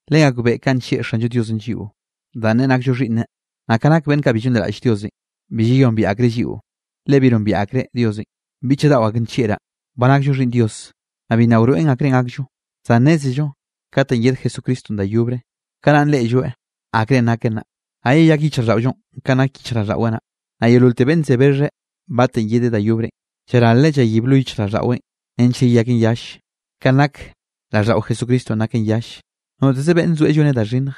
Legakbeꞌe kanꞌ nllieꞌ Xallo Diosenꞌ lliꞌo danꞌ neꞌe nakllo xhiꞌnneꞌ. Naꞌ ka nak beꞌnn kaꞌ bi llonliraꞌlle Diosenꞌ, bi llayombiaꞌ akreꞌ lliꞌo, le bi nombieꞌ akreꞌ Diosenꞌ. Biꞌchaꞌ daꞌo ak nllieꞌraꞌ, ba nakllo xhiꞌnn Dios, naꞌ bi nna wroeꞌn akrenꞌ gakllo. Zan nnézello katenꞌ yed Jesucristonꞌ da yobre, kanaꞌn reꞌlloeꞌ akrenꞌ nakeꞌ naꞌ, naꞌ yeyak yichjraꞌlldaꞌollonꞌ kanꞌ nak yichjraꞌlldaꞌweꞌ naꞌ. Naꞌ yeololte beꞌnn ze bexheꞌ batenꞌ yedeꞌ da yobrenꞌ, llaralreꞌ llayib lo yichjraꞌlldaꞌweꞌn nench yeyaken yalle, kanꞌ nak raꞌlldaꞌo Jesucristonꞌ naken yalle. Noteze beꞌnne zoeꞌ lloneꞌ da xhinnje,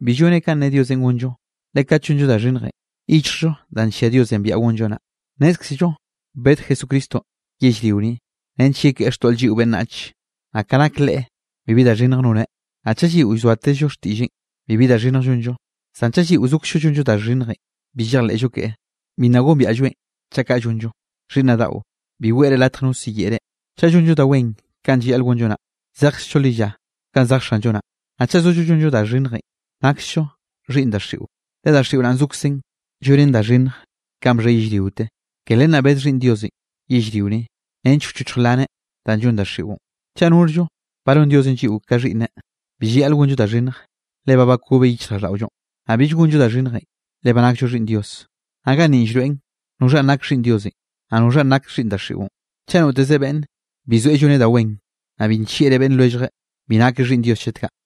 bi lloneꞌ kanꞌ ne Diosenꞌ gonllo, le kat llonllo da xhinnjenꞌ, llyichjllo danꞌ nllia Diosenꞌ biaꞌa gonllo naꞌ. Nnézkzello bed Jesucristonꞌ yellrio ni nench yekeꞌe xtoꞌl lliꞌo beꞌnnach, naꞌ ka nak Leꞌe, bibi da xhinnj noneꞌ. Naꞌ chaꞌ lliꞌo llzoatezllo xtiꞌlleꞌn, bibi da xhinnj llonllo, zan chaꞌ lliꞌo zokzllo llonllo da xhinnjenꞌ, bi llejleꞌllo keꞌe, bi nna gombiaꞌlloeꞌn chaꞌ kaꞌ llonllo. Xhiꞌnnaꞌ daꞌo, bi weꞌre latje no siyeꞌe reꞌ. Chaꞌ llonllo da wen kanꞌ llayaꞌl gonllo naꞌ, zejkzllo lilla kanꞌ zej Xanllo naꞌ. Naꞌ chaꞌ zollo llonllo da xhinnje, naksllo xhiꞌnn daxiꞌo, le daxiꞌo naꞌn zokzen llonen da xhinnj ka bxhe yellriote. Ke len naꞌ bed Xhiꞌnn Diosenꞌ yellrio ni nench wchochj wlaneꞌ danꞌ llon daxiꞌon. Chaꞌ norllo ba non Diosenꞌ lliꞌo ka xhiꞌnneꞌ, bill llayaꞌl gonllo da xhinnj, le ba bakobeꞌ yichjraꞌlldaꞌollonꞌ, naꞌ bill gonllo da xhinnjenꞌ, le ba nakllo xhiꞌnn Dios. Naꞌ ganninꞌ llroeꞌn noxhanꞌ nake xhiꞌnn Diosenꞌ, naꞌ noxhanꞌ nake xhiꞌnn daxiꞌon: chaꞌ noteze beꞌnne bi zoeꞌ lloneꞌ da wen, naꞌ bi nllieꞌreꞌ beꞌnn lwelljeꞌ, bi nakeꞌ xhiꞌnn Dios chet kaꞌ.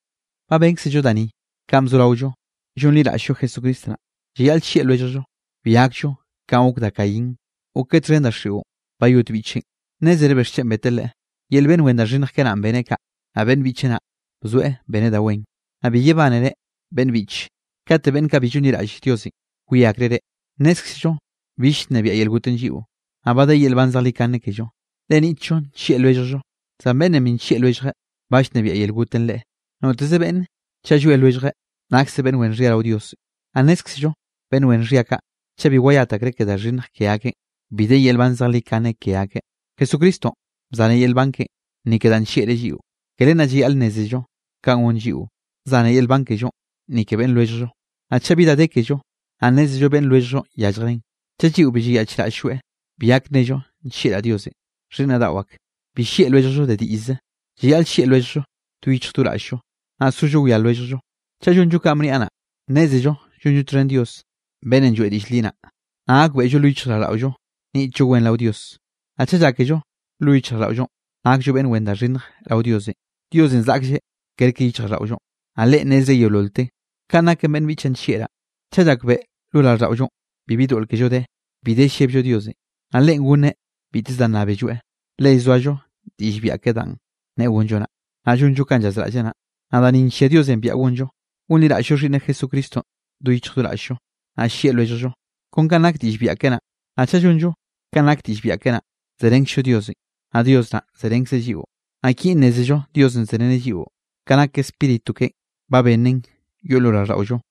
Ba bénkzello da ni kanꞌ bzoraollo llonliraꞌll-llo Jesucristo naꞌ: llayaꞌl llieꞌ lwelljllo. Bi gakllo kanꞌ gok da Caín, gokeꞌ txhen daxiꞌon bayot biꞌcheꞌn. ¿Nnézere bixchen beteꞌ leꞌe? Yel beꞌnn wen da xhinnj keꞌe naꞌn beneꞌ kaꞌ, naꞌ beꞌnn biꞌcheꞌ naꞌ bzoeꞌ beneꞌ da wen. Naꞌ bi yebánere, beꞌnne biꞌche, kate beꞌnn kaꞌ bi llonliraꞌlle Diosenꞌ wie akreꞌ reꞌ. Nnézkzello bill llnebiaꞌ yel gotenꞌ lliꞌo, naꞌ ba de yel nban zejlikane kello, le niꞌtllo nllieꞌ lwelljllo. Zan beꞌnnenꞌ bi nllieꞌ lwelljeꞌ, ba llnebiaꞌ yel gotenꞌ leꞌe. Noteze beꞌnne chaꞌ llwie lwelljeꞌ, nakseꞌ beꞌnn wen xhia rao Dios. Naꞌ nnézkzello beꞌnn wen xhia kaꞌ, chaꞌ bi wayat akreꞌ ke da xhinnj ke akeꞌn, bi de yel nban zejlikane ke akeꞌ. Jesucristonꞌ bzanreꞌ yel nban keꞌen ni ke danꞌ nllieꞌreꞌ lliꞌon, ke len naꞌ llayaꞌl nnézello kanꞌ gon lliꞌo, zane yel nban kellonꞌ ni ke beꞌnn lwelljllo. Naꞌ chaꞌ bi da de kello, naꞌ nnézello beꞌnn lwelljllonꞌ yalljreꞌn, chaꞌ lliꞌo bi llayaꞌchraꞌll-lloeꞌ, bi gak nnello: “Nllieꞌraꞌ Diosenꞌ.” Xhiꞌnnaꞌ daꞌo ak, bi llieꞌ lwelljllo de diꞌllze. Llayaꞌl llieꞌ lwelljllo do yichj do raꞌll-llo, naꞌ sollo wia lwelljllo. Chaꞌ llonllo kanꞌ bniaꞌ naꞌ, nnézello llonllo txhen Dios beꞌnnenꞌ lloeꞌ diꞌll li naꞌ, naꞌ gakbeꞌllo lo yichjraꞌlldaꞌollo niꞌtllo wen rao Dios. Naꞌ chaꞌ llákello lo yichjraꞌlldaꞌollo nakllo beꞌnn wen da xhinnj rao Diosenꞌ, Diosenꞌ zaꞌklleꞌ kerke yichjraꞌlldaꞌollo, naꞌ Leꞌen nnezreꞌ yeololte. Kanꞌ naken beꞌnn biꞌchaꞌ nllieꞌraꞌ, chaꞌ llakbeꞌe lo raꞌlldaꞌollonꞌ bibi doꞌl kello de, bi de llebllo Diosenꞌ. Naꞌ Leꞌen gonneꞌ biteze da nnábelloeꞌ, le llzoallo diꞌll biaꞌa keꞌen danꞌ neꞌe gonllo naꞌ, naꞌ llonllo kanꞌ llazraꞌlleꞌ naꞌ. Naꞌ da ni nllia Diosenꞌ biaꞌa gonllo, gonliraꞌll-llo Xhiꞌnneꞌ Jesucristonꞌ do yichj do raꞌll-llo, naꞌ llieꞌ lwelljllo, kon kanꞌ nak diꞌll biaꞌa keꞌe naꞌ. Naꞌ chaꞌ llonllo kanꞌ nak diꞌll biaꞌa keꞌe naꞌ, zerenkzllo Diosenꞌ, naꞌ Dios naꞌ zerenkzeꞌ lliꞌo. Naꞌ kinꞌ nnézello Diosenꞌ zereneꞌ lliꞌo: ka nak Spíritu keꞌen ba benneꞌn yoꞌn lo raꞌlldaꞌollo.